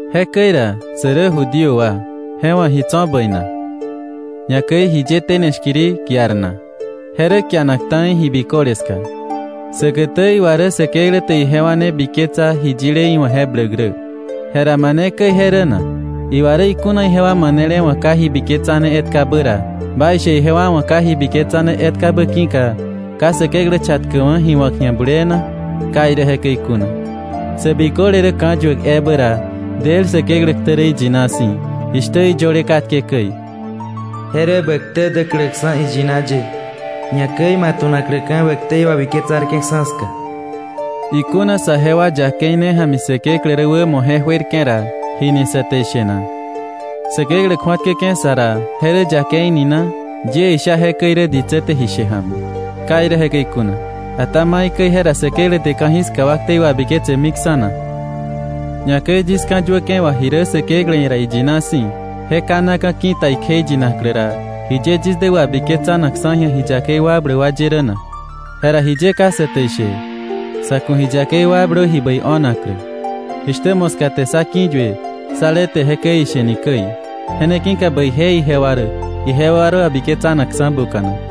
Jekäi ra, sä rä Judío wa ¿je wa̱ ji tso̱ bäi na? Ñakäi ¿jiye tene shkiri kiar na? Je rä kianak ta̱i ji biköle ska. Säkätä iwa rä Säkeklä te ijewa ne biketsa ji yile iwa̱ je bläk rä. ¿Jera mane käi je rä na? Iwa rä ikuna ijewa manele wa̱ ka ji biketsane etkabä ra, ¿baishe ijewa wa̱ ka ji biketsane etkabä ki̱ka, ka Säkeklä chatkäkwa̱ ji wa̱k ji̱a bulee na? ¡Ka irä jekäi kuna! Sä biköle rä ka̱yuäk ebä ra, del Säkeklä ktä rä iyina si̱, jishtä iyöle katke käi: “Je rä bä ktä däkläksa̱ iyina ye, ñakäi ma tu̱nakläka̱ bä ktei wabiketsarke̱ksa̱ ska.” Ikuna saje wa yakei ne ja̱mi Säkeklä rä wämo je juerke̱ ra, ¿jini sa te ishe na? Säkeklä kju̱atkäke̱ sa ra ¿je rä yakei ni na? Yie isha jekäi rä ditsä te ji she ja̱mi. ¡Ka irä jekäi kuna! ¿Ata maikäi jera Säkeklä te ka̱jiska wa ktei wabiketsemiksa̱ na? Ñakäi yis ka̱yuäke̱ wà ji rä Säkeklä ia̱ ra iyina si̱, je kanaka̱ ki̱ta ikjeiyinaklä ra, ¿jiye yis dä wabiketsanakksa̱ ji̱a ji yakei wakbläk ye rä na? Jera jiye ka sa te ishe: “Sa̱ ku̱ ji yakei wakblö ji bäi o̱naklä”, jishtä moska te sá ki̱yue sá le te jekäi ishe ni käi. Je ne ki̱ka bäije ijewa rä, ijewa rä wabiketsanakksa̱ buka̱nak.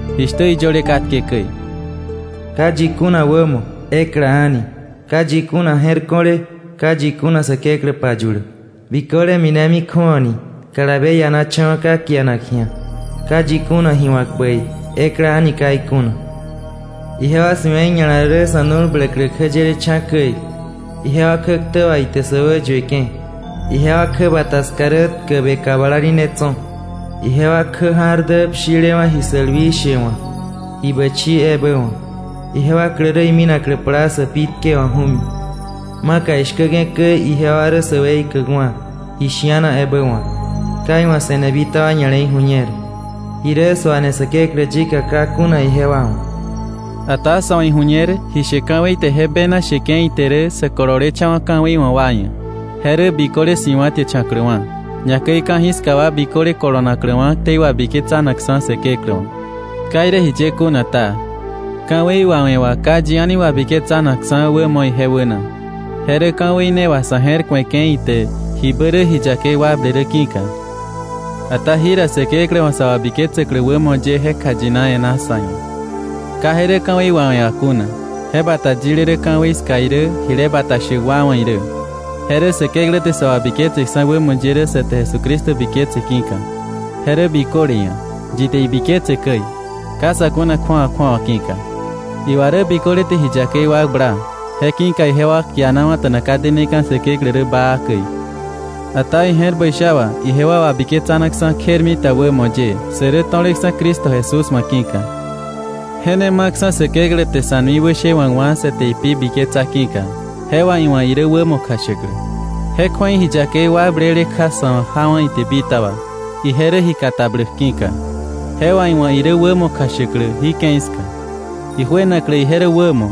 jishtä iyöle katke käi: “Ka yi kuna wämo, ekla a̱ni; ka yi kuna je̱r ko̱le, ka yi kuna Säkeklä payuläk. Biköle minemi kju̱awani, kalabe ianacha̱wa̱ ka kianak ji̱a. Ka yi kuna ji wa̱k bäi, ekla a̱ni ka ikuna. Ijewa si̱we̱i ña̱la rä sa̱ nu̱l bläklä kjäyelecha̱ käi. Ijewa kjäktä wà ite sä wäyueke̱. Ijewa kjäbata ska rä tkäbe kablali ne tso̱. Ijewa kjä ja̱r dä pshilewa̱ ji sälwi she wa̱, ji bächii ebä wa̱. Ijewa klä rä iminaklä plaa sä pi tkewa̱k ju̱mi. Maka ishkäke̱ käi, ijewa rä sä weikäkwa̱, ji shi̱ana ebä wa̱k. Ka iwa̱ se̱ne bitaba ña̱le̱i ju̱ñer. Ji rä suane Säkeklä yika ka kuna ijewa wa̱.” Ata sa̱ wa̱ ju̱ñer ji she ka̱wei te je bena sheke̱ ite rä, sä kololecha̱wa̱ ka̱wei wa̱ wa ia̱, je rä biköle si̱wa̱tiächa̱kläwa̱, ñakäi ka̱jiska wa biköle kolonakläwa̱ ktei wabiketsanakksa̱ Säkeklä wa̱. Ka irä jiye kuna ta, ka̱wei wawe̱ wá, ka yi a̱ni wabiketsanakksa̱ wämo ije wäna, je rä ka̱wei ne wà sa̱ je̱r ku̱eke̱ ite jibä rä ji yakei wakble rä ki̱ka. Ata jira Säkeklä wa̱ sä wabiketsäklä wämo ye je kjayina e̱ná sa̱ ia̱. Ka je rä ka̱wei wawe̱ wà kuna. Je bata yile rä ka̱wei ska irä jile bata shäk wa wa̱ irä. Je rä Säkeklä te sä wabiketseksa̱ wämo ye rä sa te Jesucristo biketse ki̱ka. Je rä biköle ia̱, yi te ibiketse käi, ka sa̱ kuna kju̱awa kju̱awa ki̱ka. Iwa rä biköle te ji yakei wakbla, je ki̱ka ijewa kianawa̱ta̱na ka deneka̱ Säkeklä rä baa käi. Ata ije̱r bäi sha wà ijewa wabiketsanaksa̱ kjermita wämo ye, sä rä to̱leksa̱ Cristo Jesús wa̱ ki̱ka. Je ne ma̱ksa̱ Säkeklä te sa̱ nui wäshewa̱kwa̱ sa te ipi biketsa ki̱ka, je wà iwa̱ irä wämo kjashäklä. Je kju̱ei ji yakei wakblele kja sa̱ wa̱ jawa̱ ite bitaba, ije rä ji katabläk ki̱ka. Je wà iwa̱ irä wämo kjashäklä jí ke̱i ska, ijuenaklä ije rä wämo,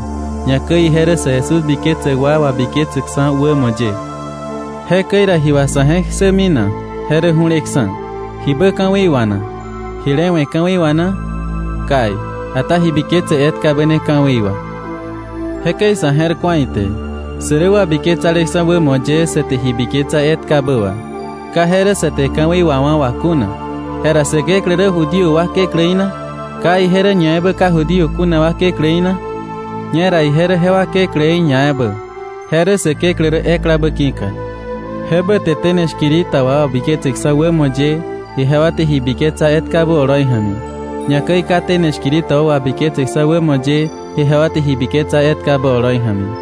ñakäi ije rä sä Jesús biketsäk wa wabiketsäksa̱ wämo ye. Jekäi ra, ¿ji wà sa̱ je̱k ssämi na? Je rä ju̱leksa̱. ¿Jibä ka̱wei wà na? ¿Jile we̱ ka̱wei wà na? Kai. Ata ji biketse etkabä ne ka̱wei wà. Jekäi sa̱ je̱r ku̱a ite, sä rä wabiketsaleksa̱ wämo ye, sa te ji biketsa etkabä wà. Ka je rä sa te ka̱wei wawá̱ wà kuna. Jera ¿Säkeklä rä Judío wa kekläí na? ¿Ka ije rä ñaebä ka Judío kuna wa kekläí na? Ñera ije rä jewa kekläí ñaebä, je rä Säkeklä rä eklabä ki̱ka. Jebä te tene shkiri ta wa wabiketseksa̱ wämo ye ijewa te ji biketsa etkabä oloi ja̱mi, ñakäi ka tene shkiri ta wa wabiketseksa̱ wämo ye ijewa te ji biketsa etkabä oloi ja̱mi.